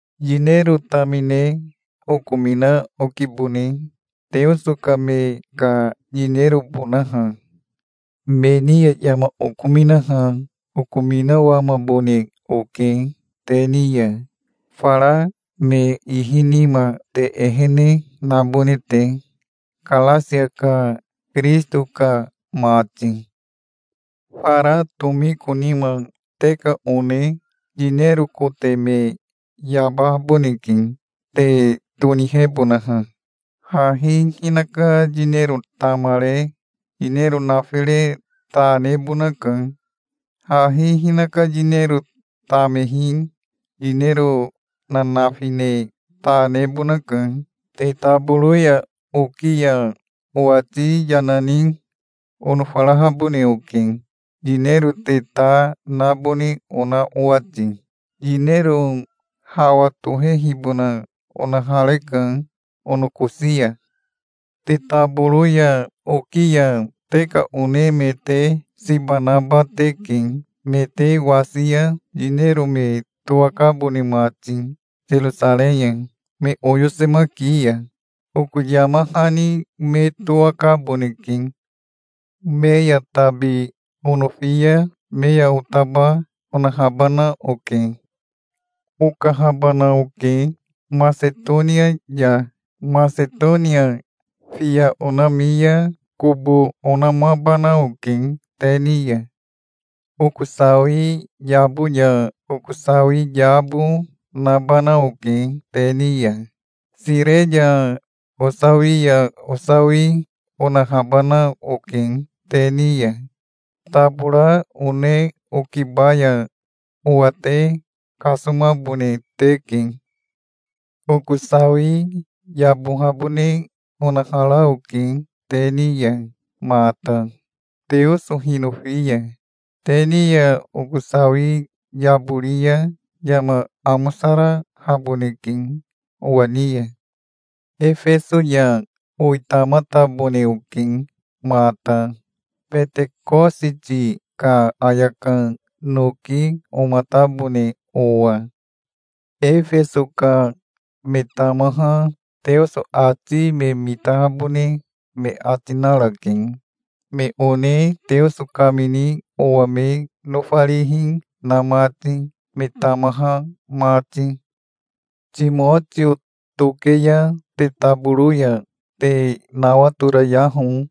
Yinero tamine okomina okibone, Teoso ka me ka yinerobonaha. Me ni ya yama okominaha okominawamabone oke te ni ya, fara me ihi nima te ehene nabone te, Karasia ka Kirisito ka mati. Fara tomiko nima te ka one yinero kote me yabahaboneke, te tonihebonaha. Hahi hinaka yinero tamare yinero nafire ta nebonaka. Hahi hinaka yinero tamehi yinero nanafi ne ta nebonaka. Te taboro ya oki ya owati yana ni onofarahabone oke, yinero te ta nabone ona owati. Yinero hawa tohehibona onahareka onokosi ya. Te taboro ya oki ya te ka one me te siba naba teke, me te wasi ya yinero me towakabone mati Serosarei ya, me oyosemaki ya. Oko yama hani me towakaboneke. Me ya tabi onofi ya me ya otaba onahabana oke. Okahabana oke Masetonia ya. Masetonia fiya onami ya kobo onamabana oke te ni ya. Oko sawi yabo ya oko sawi yabo nabana oke te ni ya. Sire ya osawi ya osawi onahabana oke te ni ya. Tabora one okiba ya owa te kasomabone teke. Oko sawi yabohabone onahara oke te ni ya mata, Teoso hinofi ya. Te ni ya oko sawi yabori ya yama amosarahaboneke owa ni ya. Efeso ya owitamatabone oke mata, Betekositi ka ayaka noki omatabone owa. Efeso ka me tamaha Teoso ati me mitahabone me ati narake, me one Teoso kamini owa me nofarihi na mati, me tamaha mati. Timotio toke ya te taboro ya te nawatorayaho.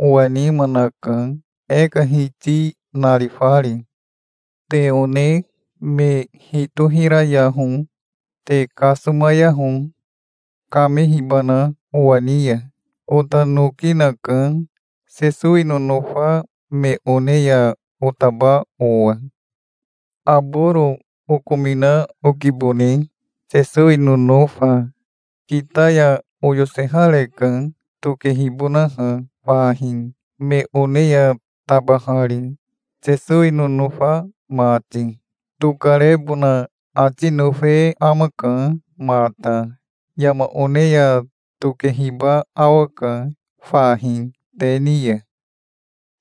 Owa nima naka, e ka Hiti narifari. Te one me hitohirayaho. Te kasomayaho, kamehibana owa ni ya. Ota noki naka, Sesowi nonofa me one ya otaba owa. Aboro okomina okibone, Sesowi nonofa. Kita ya oyosehareka, tokehibonaha fahi, me one ya tabahari, Sesowi nonofa mati. Tokarebona ati nofe amaka mata. Yama one ya tokehiba awaka fahi te ni ya.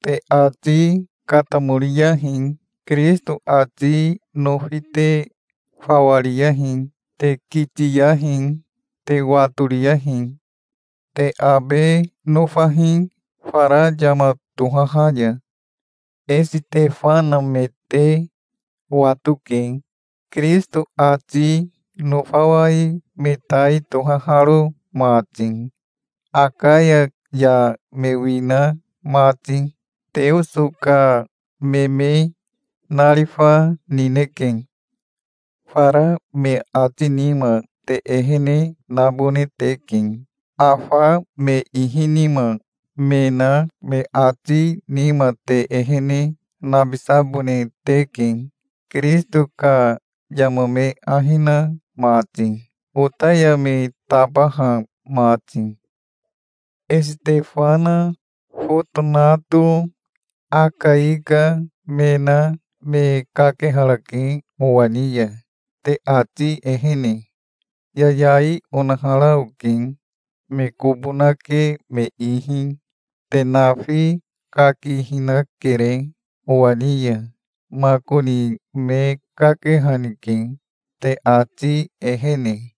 Te ati katamoriyahi. Kirisito ati nofi te fawa riyahi. Te kitiyahi. Te watoriyahi. Te abe nofahi fara yama tohaha ya. Esitefana me te watoke, Kirisito ati nofawai me tai tohaharo mati, Akaya ya me wina mati. Teoso ka me me narifa nineke. Fara me ati nima te ehene nabone teke. Afa me ihi nima me na me ati nima te ehene nabisabone teke, Kirisito ka yama me ahi na mati, ota ya me tabaha mati. Esitefana Fotonato Akaika me na me kakeharake owa ni ya, te ati ehene. Yayai onahara oke me kobo nake me ihi. Te nafi kakihinakere owa ni ya. Makoni me kakehanike, te ati ehene.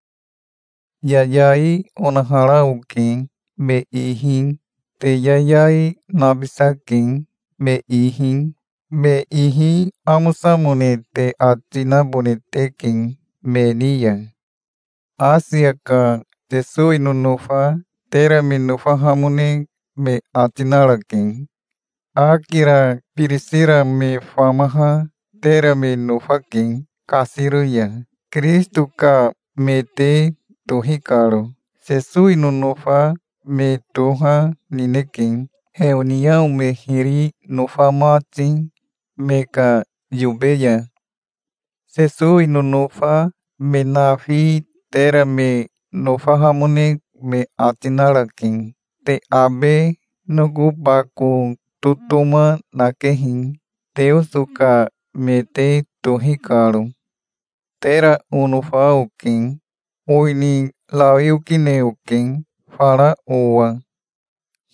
Yayai onahara oke me ihi. Te yayai nabisake me ihi. Me ihi amosamone te ati nabone teke me ni ya. Asia ka Sesowi nonofa tera me nofahamone me ati narake. Akira Birisira me famaha tera me nofake kasiro ya, Kirisito ka me te tohi karo. Sesowi nonofa me toha nineke, heoniao me hiri nofa mati me ka yobe ya. Sesowi nonofa me nafi tera me nofahamone me ati narake. Te abe noko bako totoma nakehi, Teoso ka me te tohi karo. Tera onofa oke. Owini rawi okine oke fara owa.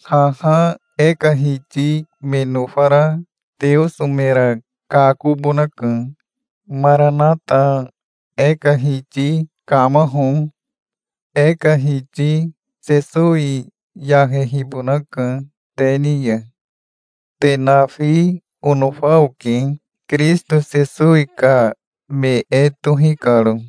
Haha e ka Hiti me nofara Teoso mera kakobonaka. Maranata. E ka Hiti kamaho. E ka Hiti Sesowi yahehibonaka te ni ya. Te nafi onofa oke, Kirisito Sesowi ka me e tohi karo.